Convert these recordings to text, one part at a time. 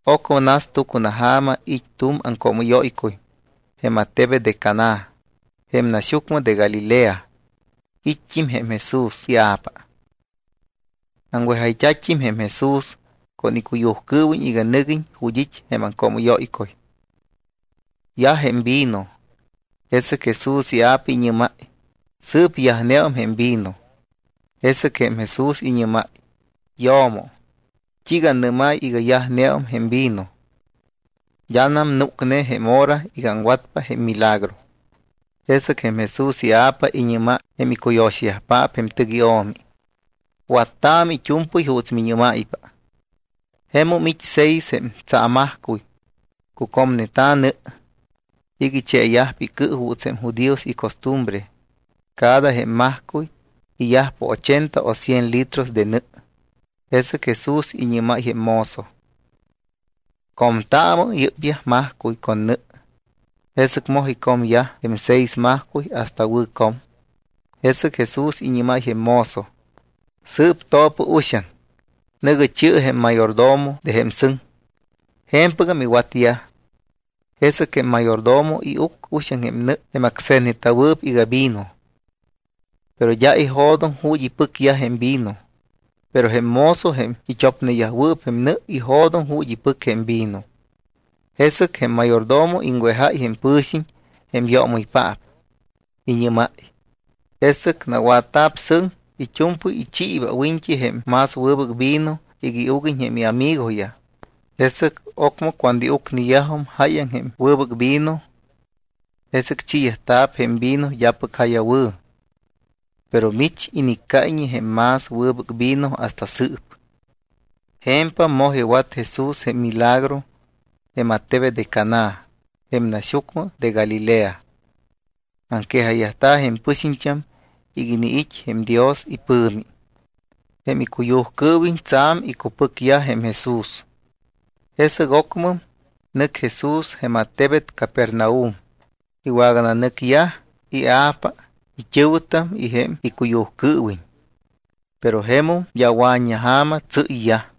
Ocmɨ nas tucunaja̱ma, it́ tu̱m aŋcoomɨ́yóycuy jém attebet de Caná jém naxyucmɨ de Galilea, it́t́im jém Jesús ia̱pa. Aŋwejayyajta̱t́im jém Jesús con icuyujcɨɨwiñ iga nɨguiñ ju̱t́ it́ jém aŋcoomɨ́yóycuy. Yaj jém vino, jesɨc Jesús ia̱pa iñɨ́máy: —Sɨɨp yajneum jém vino. Jesɨc jém Jesús iñɨ́máy: —Yo̱mo, ¿t́iiga annɨ́máy iga yajneum jém vino? D́anam núcne jém hora iga aŋwatpa jém milagro. Jesɨc jém Jesús ia̱pa iñɨ́máy jém icuyo̱xayajpaap jém tɨc io̱mi: —Wattaamɨ it́u̱mpɨy juuts miñɨ́máypa. Jemum it́ seis jém tsaamajcuy. Cucómayñeta̱ nɨ iga icheeyajpa icɨ juuts jém judíos icostumbre. Cada jém majcuy iyajpa ochenta o cien litro de nɨ. Jesɨc Jesús iñɨ́máy jém mozo: —Comtaamɨ yɨ́pyaj majcuy con nɨ. Jesɨc moj icomyaj jém seis majcuy hasta wɨ̱ com. Jesɨc Jesús iñɨ́máy jém mozo: —Sɨɨp to̱pɨ uxaŋ, nɨ̱gɨ chi̱ɨ jém mayordomo de jém sɨŋ. Je̱mpɨgam iwatyaj. Jesɨc jém mayordomo iuc uxaŋ jém nɨ jém acse̱tneta̱wɨɨp iga vino, pero d́a ijo̱doŋ ju̱t́ ipɨcyaj jém vino. Pero jém mozo, jém it́opneyajwɨɨp jém nɨ, ijo̱doŋ ju̱t́ ipɨc jém vino. Jesɨc jém mayordomo iŋwejáy jém pɨ̱xiñ jém yoomɨypaap. Iñɨ́máy: —Jesɨc nawatta̱p sɨŋ, it́u̱mpɨy ichiiba wiñt́i jém más wɨbɨc vino iga iuguiñ jém iamigoyaj. Jesɨc ocmɨ cuando iucneyajum jáyaŋ jém wɨbɨc vino, jesɨc chiiyajta̱p jém vino d́apɨc ja̱ya wɨ̱. Pero mich iniccáyñe jém más wɨbɨc vino hasta sɨɨp. Je̱mpam moj iwat Jesús jém milagro jém attebet de Caná, jém naxyucmɨ de Galilea. Aŋquejayyajta̱ jém pɨxiñt́am iga iniit́ jém Dios ipɨ̱mi. Jém icuyujcɨɨwiñ tsa̱m icupɨcyaj jém Jesús. Jesɨc ocmɨm, nɨc Jesús jém attebet Capernaum. Iwagananɨcyaj ia̱pa, it́ɨ̱wɨtam y jém icuyujcɨɨwiñ. Pero jemum d́a wa̱t́ña ja̱ma tsɨ́yyaj.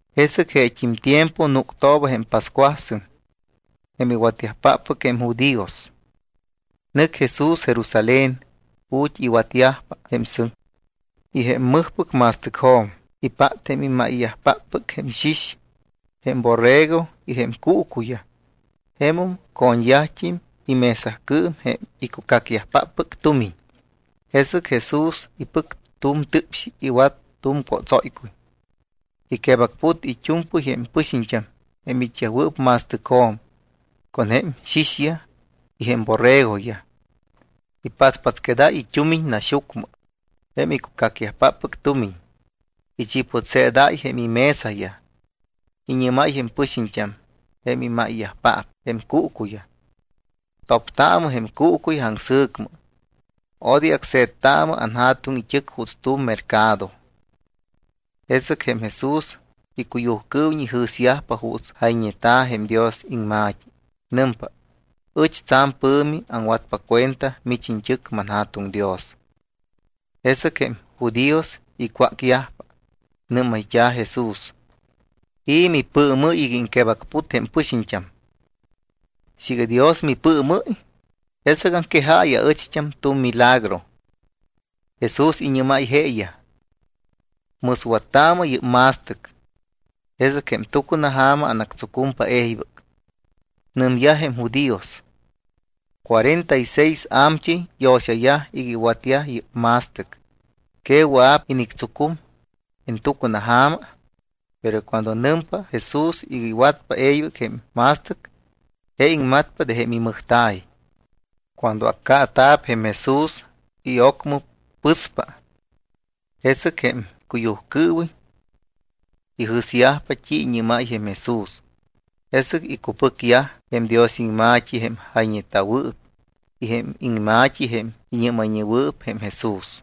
Jesɨc jeet́im tiempo núctooba jém pascuasɨŋ jém iwatyajpáppɨc jém judíos. Nɨc Jesús Jerusalén ju̱t́ iwatyajpa jém sɨŋ. Y jém mɨjpɨc ma̱stɨcjo̱m ipát jém imáyyajpáppɨc jém xix, jém borrego y jém cuucuyaj. Jemum co̱ñyajt́im imesacɨɨm jém icucacyajpáppɨc tumiñ. Jesɨc Jesús ipɨc tu̱m tɨpxi, iwat tu̱m cótsóycuy. Iquebacput it́u̱mpɨy jém pɨxiñt́am jém it́wɨɨp ma̱stɨcjo̱m con jém xixyaj y jém borregoyaj. Ipatspatsquedáy it́umiñ naxyucmɨ jém icucacyajpáppɨc tumiñ. Ichiputseedáy jém imesayaj. Iñɨ́máy jém pɨxiñt́am jém imáyyajpaap jém cuucuyaj: —Toptaamɨ jém cuucuyaj aŋsɨ̱cmɨ. Odoy acse̱ttaamɨ anJa̱tuŋ it́ɨc juuts tu̱m mercado. Jesɨc jém Jesús icuyujcɨɨwiñ ijɨ̱syajpa juuts jayñeta̱ jém Dios iŋma̱t́i. Nɨmpa: “Ɨch tsa̱m pɨ̱mi aŋwatpa cuenta mich iñt́ɨc, manJa̱tuŋ Dios.” Jesɨc jém judíos icwácyajpa. Nɨ́mayt́a̱ Jesús: —¿I̱ mipɨɨmɨ́y iga iŋquebacput jém pɨxiñt́am? Siiga Dios mipɨɨmɨ́y, jesɨc aŋquejaayɨ aɨcht́am tu̱m milagro. Jesús iñɨ́máy jeeyaj: —Mɨswattaamɨ yɨ́p ma̱stɨc, jesɨc jém tucunaja̱ma anactsucumpa e̱ybɨc. Nɨmyaj jém judíos: —Cuarenta y seis a̱mt́ɨy yo̱xayaj iga iwatyaj yɨ́p ma̱stɨc. ¿Que wɨa̱p inictsucum en tucunaja̱ma? Pero cuando nɨmpa Jesús iga iwatpa e̱ybɨc jém ma̱stɨc, je iŋmatpa de jém imɨjta̱y. Cuando accaata̱p jém Jesús y ocmɨ pɨspa, jesɨc jém icuyujcɨɨwiñ ijɨ̱syajpa t́i iñɨ́máy jém Jesús. Jesɨc icupɨcyaj jém Dios iŋma̱t́i jém jayñeta̱wɨɨp y jém iŋma̱t́i jém iñɨ́mayñewɨɨp jém Jesús.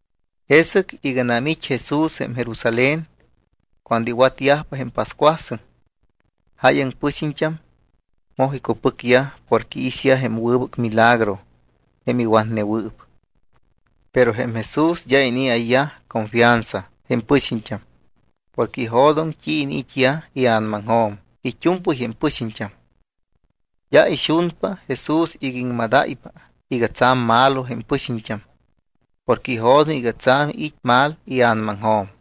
Jesɨc iganam it́ Jesús jém Jerusalén, cuando iwatyajpa jém pascuasɨŋ, jáyaŋ jém pɨxiñt́am moj icupɨcyaj porque iixyaj jém wɨbɨc milagro jém iwatnewɨɨp. Pero jém Jesús d́a inii̱ayyaj confianza jém pɨxiñt́am, porque ijo̱doŋ t́i iniit́yaj ia̱namaŋjo̱m it́u̱mpɨy jém pɨxiñt́am. D́a ixunpa Jesús iga i̱ iŋmadáypa iga tsa̱m malo jém pɨxiñt́am, porque ijo̱doŋ iga tsa̱m it́ mal ia̱namaŋjo̱m.